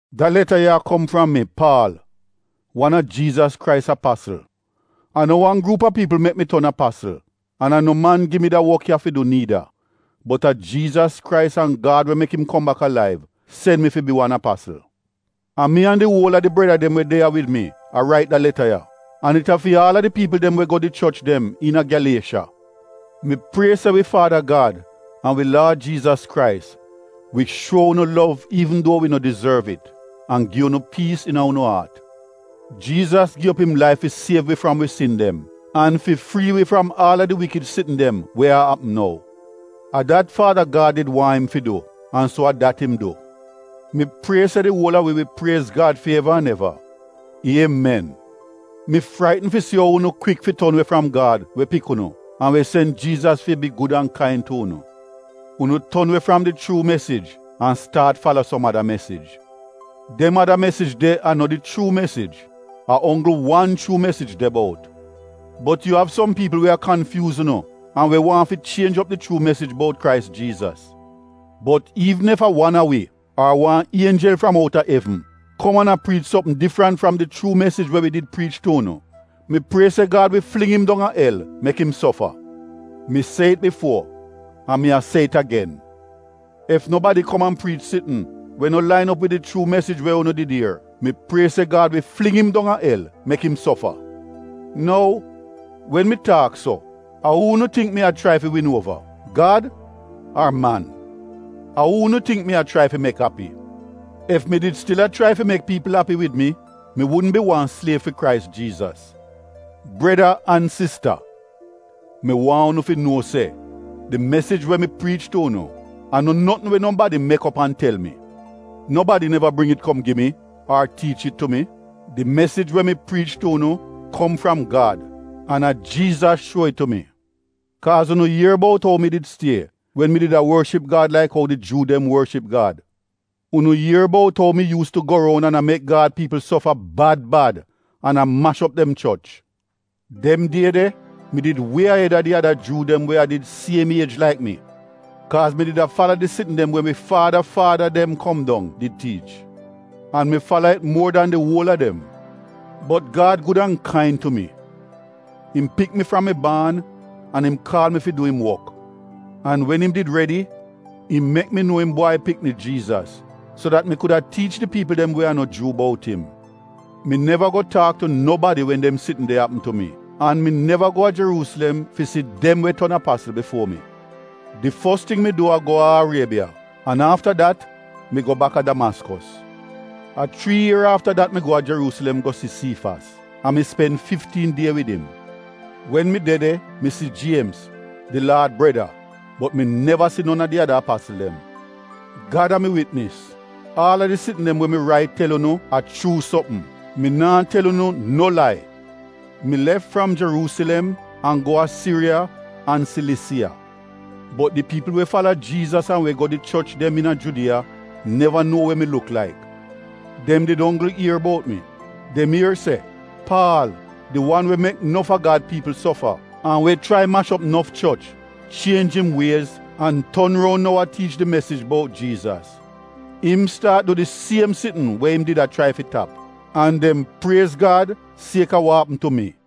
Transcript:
Da leta ya a kom fram mi, Paal, wan a Jiizas Krais apasl. A no wan gruup a piipl mek mi ton apasl an a no man gi mi da wok ya fi du niida. Bot a Jiizas Krais an Gad we mek im kom bak alaiv sen mi fi bi wan apasl. A mi an di uol a di breda dem we de ya wid mi a rait da leta ya, an it a fi aal a di piipl dem we go di choch dem iina Gyaliesha. Mi prie se wi Faada Gad an wi Laad Jiizas Krais wi shuo unu lov iivn duo wi no dizorv it an gi unu piis iina unu aat. Jiizas gi op im laif fi siev wi fram wi sin dem an fi frii wi fram aal a di wikid sitn dem we a apm nou. A dat Faada Gad did waahn im fi du an so a dat im du. Mi prie se di uol a wi wi priez Gad fi eva an eva! Iemen! Mi fraitn fi si ou unu kwik fi ton we fram Gad we pik unu an we sen Jiizas fi bi gud an kain tu unu. Unu ton we fram di chuu mesij an staat fala som ada mesij. Dem ada mesij de a no di chuu mesij — a onggl wan chuu mesij de bout. Bot yu av som piipl we a kanfyuuz unu an we waahn fi chienj op di chuu mesij bout Krais Jiizas. Bot iivn ef a wan a wi ar wan ienjel fram outa evn kom an a priich sopm difrent fram di chuu mesij we wi did priich tu unu, mi prie se Gad wi fling im dong a el mek im sofa. Mi se it bifuo an mi a se it agen, ef nobadi kom an priich sitn we no lain op wid di chuu mesij we unu did ier — mi prie se Gad wi fling im dong a el mek im sofa. Nou, wen mi taak so, a uu unu tingk mi a chrai fi win uova, Gad ar man? A uu unu tingk mi a chrai fi mek api? Ef mi did stil a chrai fi mek piipl api wid mi, mi wudn bi wan sliev fi Krais Jiizas. Breda an sista mi waahn unu fi nuo se di mesij we mi priich tu unu, a no notn we nobadi mek op an tel mi. Nobadi neva bring it kom gi mi ar tiich it tu mi. Di mesij we mi priich tu unu kom fram Gad an a Jiizas shuo it tu mi. Kaaz unu ier bout ou mi did stie wen mi did a worship Gad laik ou di Juu dem worship Gad. Unu ier bout ou mi yuus tu go roun an a mek Gad piipl sofa bad bad an a mash op dem choch. Dem die de, mi did wie ahed a di ada Juu dem we a did di siem iej laik mi. Kaaz mi did a fala di sitn dem we wi faada faada dem kom dong did tiich. An mi fala it muor dan di uol a dem. Bot Gad gud an kain tu mi. Im pik mi fram mi baan an im kaal mi fi du im wok. An wen im did redi im mek mi nuo im Bwai Pikni, Jiizas, so dat mi kuda tiich di piipl dem we a no Juu bout im. Mi neva go taak tu nobadi wen dem sitn de apm tu mi, an mi neva go a Jeruusilem fi si dem we ton apasl bifuo mi. Di fos ting mi du a go a Ariebiya an afta dat mi go baka Damaskos. A chrii ier afta dat mi go a Jeruusilem go si Siifas an mi spen fiftiin die wid im. Wen mi de de mi si Jiemz, di Laad breda bot mi neva si non a di ada apasl dem. Gad a mi witnis. Aal a di sitn dem we mi rait tel unu a chuu sopm — mi naa tel unu no lai. Mi lef fram Jeruusilem an go a Siriya an Silisiya. Bot di piipl we fala Jiizas an we go di choch dem iina Judiya neva nuo we mi luk laik. Dem did onggl ier bout mi. Dem ier se, “Paal, di wan we mek nof a Gad piipl sofa an we chrai mash op nof choch, chienj im wiez an ton roun nou a tiich di mesij bout Jiizas. Im staat du di siem ting we im did a chrai fi tap.” An dem priez Gad sieka wa apm tu mi.